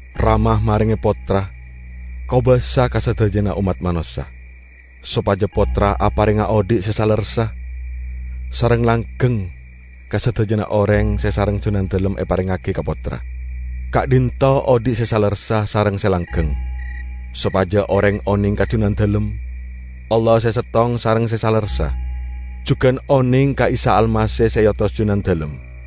Rama marenge Pottra kobasa ka sadajana ommat manossa, sopaja Pottra aparenga odhi' se salerressa sareng langgeng ka sadajana oreng se sareng Junandalem eparengngagi ka Pottra. Ka'dhinto' odhi' se salerressa sareng se langgeng; sopaja oreng oneng ka Junandalem, Allah se settong sareng se salerressa, jugan oneng ka Isa Almasih se eotos Junandalem.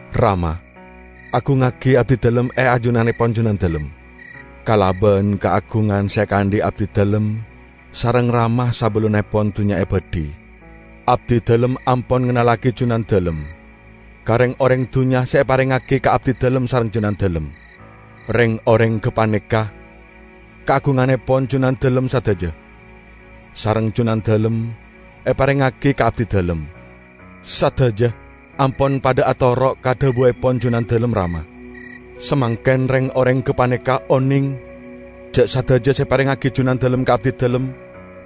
Rama! Agungngagi Abdidalem e ajunannepon Junandalem, kalaban kaagungan se ekaandhi' Abdidalem sareng Rama sabellunnepon dunnya ebadhi. Abdidalem ampon ngennallagi Junandalem ka reng-oreng dunnya se eparengngagi ka Abdidalem sareng Junandalem. Reng-oreng gapaneka kaagungannepon Junandalem sadaja, sareng Junandalem eparengngagi ka Abdidalem. Sadaja ampon padha atoro' ka dhabuepon Junandalem, Rama. Samangken reng-oreng gapaneka oneng ja' sadaja se eparengngagi Junandalem ka Abdidalem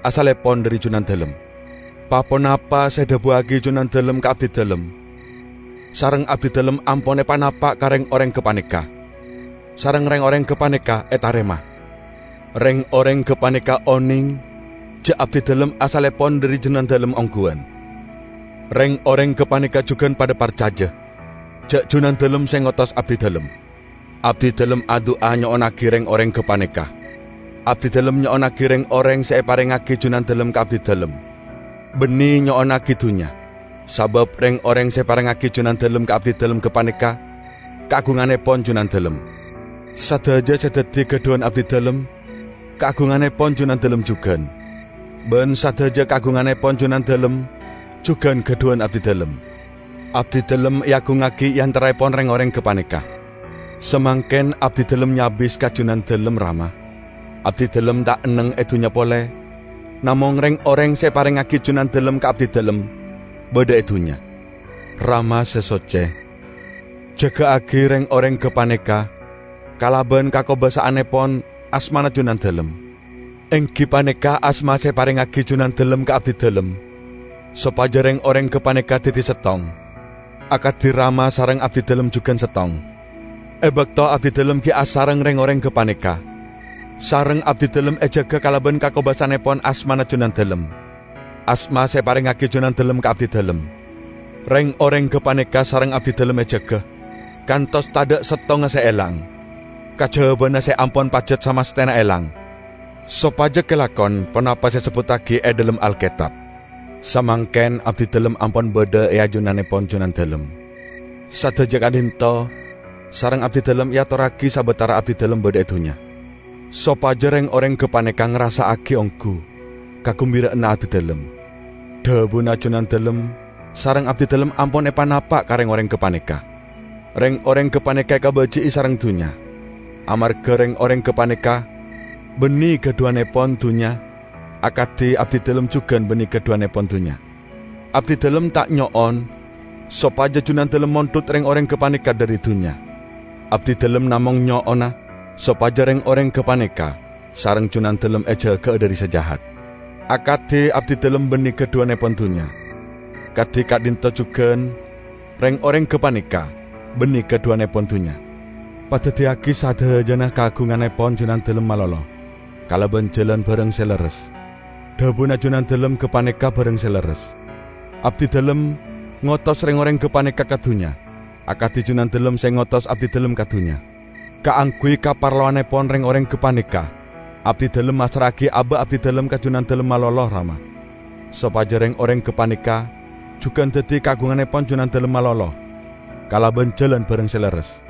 asallepon dhari Junandalem. Pa-ponapa se edhabuwagi Junandalem ka Abdidalem, sareng Abdidalem ampon epanapa' ka reng-oreng gapaneka; sareng reng-oreng gapaneka etarema. Reng-oreng gapaneka oneng ja' Abdidalem asallepon dhari Junandalem ongguwan, reng-oreng gapaneka jugan padha parcaja ja' Junandalem se ngotos Abdidalem. Abdidalem adu'a nyo'onnagi reng-oreng gapaneka. Abdidalem nyo'onnagi reng-oreng se eparengngagi Junandalem ka Abdidalem, banne nyo'onnagi dunnya, sabab reng-oreng se eparengngagi Junandalem ka Abdidalem gapaneka kaagungannepon Junandalem. Sadaja se daddi gadhuwan Abdidalem kaagungannepon Junandalem jugan, ban sadaja kaagungannepon Junandalem jugan gadhuwan Abdidalem. Abdidalem eagungngagi e antaraepon reng-oreng gapaneka. Samangken Abdidalem nyabis ka Junandalem, Rama. Abdidalem ta' enneng e dunnya pole, namong reng-oreng se eparengngagi Junandalem ka Abdidalem badha e dunnya. Rama Se socce! Jaga'agi reng-oreng gapaneka kalaban kakobasa'annepon asmana Junandalem, enggi paneka asma se eparengngagi Junandalem ka Abdidalem sopaja reng-oreng gapaneka daddi settong, akadi Rama sareng Abdidalem jugan settong. E bakto Abdidalem gi' asareng reng-oreng gapaneka, sareng Abdidalem ejaga kalaban kakobasa'annepon asmana Junandalem, asma se eparengngagi Junandalem ka Abdidalem. Reng-oreng gapaneka sareng Abdidalem ejaga, kantos tadha' settonga se elang, kajabana se ampon pajat samasthena elang, sopaja kalakon ponapa se esebbuttagi e dhalem Alketab. Samangken Abdidalem ampon badha e ajunannepon Junandalem. Sadaja ka'dhinto' sareng Abdidalem eatorragi sabatara Abdidalem badha e dunnya; sopaja reng-oreng gapaneka ngarassa'agi onggu kagumbira'anna Abdidalem. Dhabuna Junandalem sareng Abdidalem ampon epanapa' ka reng-oreng gapaneka; reng-oreng gapaneka ekabaji'i sareng dunnya amarga reng-oreng gapaneka banne gadhuwannepon dunnya akadi Abdidalem jugan banne gadhuwannepon dunnya. Abdidalem ta' nyo'on sopaja Junandalem mondhut reng-oreng gapaneka dhari dunnya; Abdidalem namong nyo'ona sopaja reng-oreng gapaneka sareng Junandalem ejaga'a dhari se Jahat. Akadi Abdidalem banne gadhuwannepon dunnya, kadi ka'dhinto' jugan reng-oreng gapaneka banne gadhuwannepon dunnya. Padaddiyagi sadajana kaagungannepon Junandalem malolo kalaban jalan barang se lerres; dhabuna Junandalem gapaneka barang se lerres. Abdidalem ngotos reng-oreng gapaneka ka dunnya, akadi Junandalem se ngotos Abdidalem ka dunnya. Kaangguy kaparlowannepon reng-oreng gapaneka Abdidalem massra'agi aba' Abdidalem ka Junandalem malolo, Rama, sopaja reng-oreng gapaneka jugan daddi kaagungannepon Junandalem malolo kalaban jalan barang se lerres.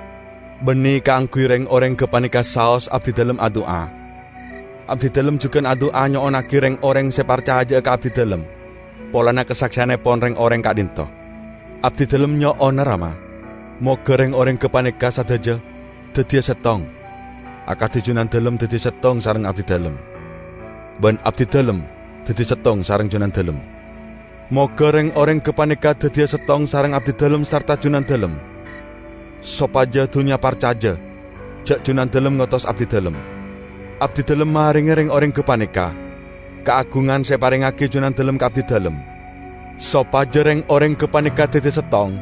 Banne kaangguy reng-oreng gapaneka saos Abdidalem adu'a; Abdidalem jugan adu'a nyo'onnagi reng-oreng se parcaja'a ka Abdidalem polana kasakseyannepon reng-oreng ka'dhinto'. Abdidalem nyo'ona, Rama, moga reng-oreng gapaneka sadaja daddiya settong, akadi Junandalem daddi settong sareng Abdidalem, ban Abdidalem daddi settong sareng Junandalem. Moga reng-oreng gapaneka daddiya settong sareng Abdidalem sarta Junandalem sopaja dunnya parcaja ja' Junandalem ngotos Abdidalem. Abdidalem marenge reng-oreng gapaneka kaagungan se eparengngagi Junandalem ka Abdidalem, sopaja reng-oreng gapaneka daddi settong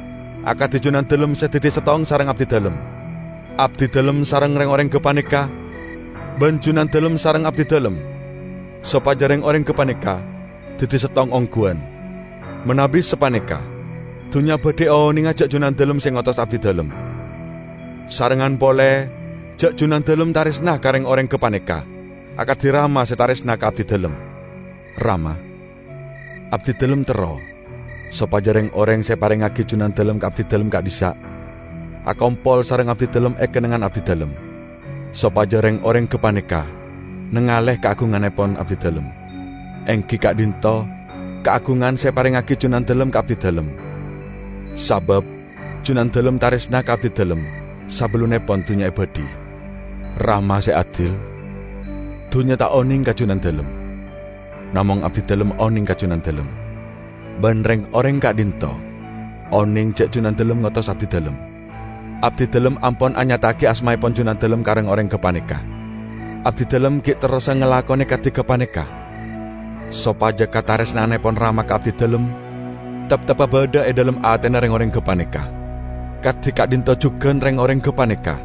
akadi Junandalem se daddi settong sareng Abdidalem. Abdidalem sareng reng-oreng gapaneka, ban Junandalem sareng Abdidalem; sopaja reng-oreng gapaneka daddi settong ongguwan. Manabi sapaneka dunnya badhi onenga ja' Junandalem se ngotos Abdidalem, sarengngan pole ja' Junandalem taresna ka reng-oreng gapaneka akadi Rama se taresna ka Abdidalem. Rama, Abdidalem terro sopaja reng-oreng se eparengngagi Junandalem ka Abdidalem ka'dhissa' akompol sareng Abdidalem e kennengngan Abdidalem sopaja reng-oreng gapaneka nengale kaagungannepon Abdidalem, enggi ka'dhinto' kaagungan se eparengngagi Junandalem ka Abdidalem, sabab Junandalem taresna ka Abdidalem sabellunnepon dunnya ebadhi. Rama se adil! Dunnya ta' oneng ka Junandalem, namong Abdidalem oneng ka Junandalem; ban reng-oreng ka'dhinto' oneng ja' Junandalem ngotos Abdidalem. Abdidalem ampon anyata'agi asmaepon Junandalem ka reng-oreng gapaneka; Abdidalem gi' terrosa ngalakone kadi gapaneka sopaja kataresna'annepon Rama ka Abdidalem teptebba badha e dhalem atena reng-oreng gapaneka, kadi ka'dhinto' jugan reng-oreng gapaneka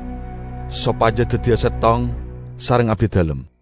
sopaja daddiya settong sareng Abdidalem."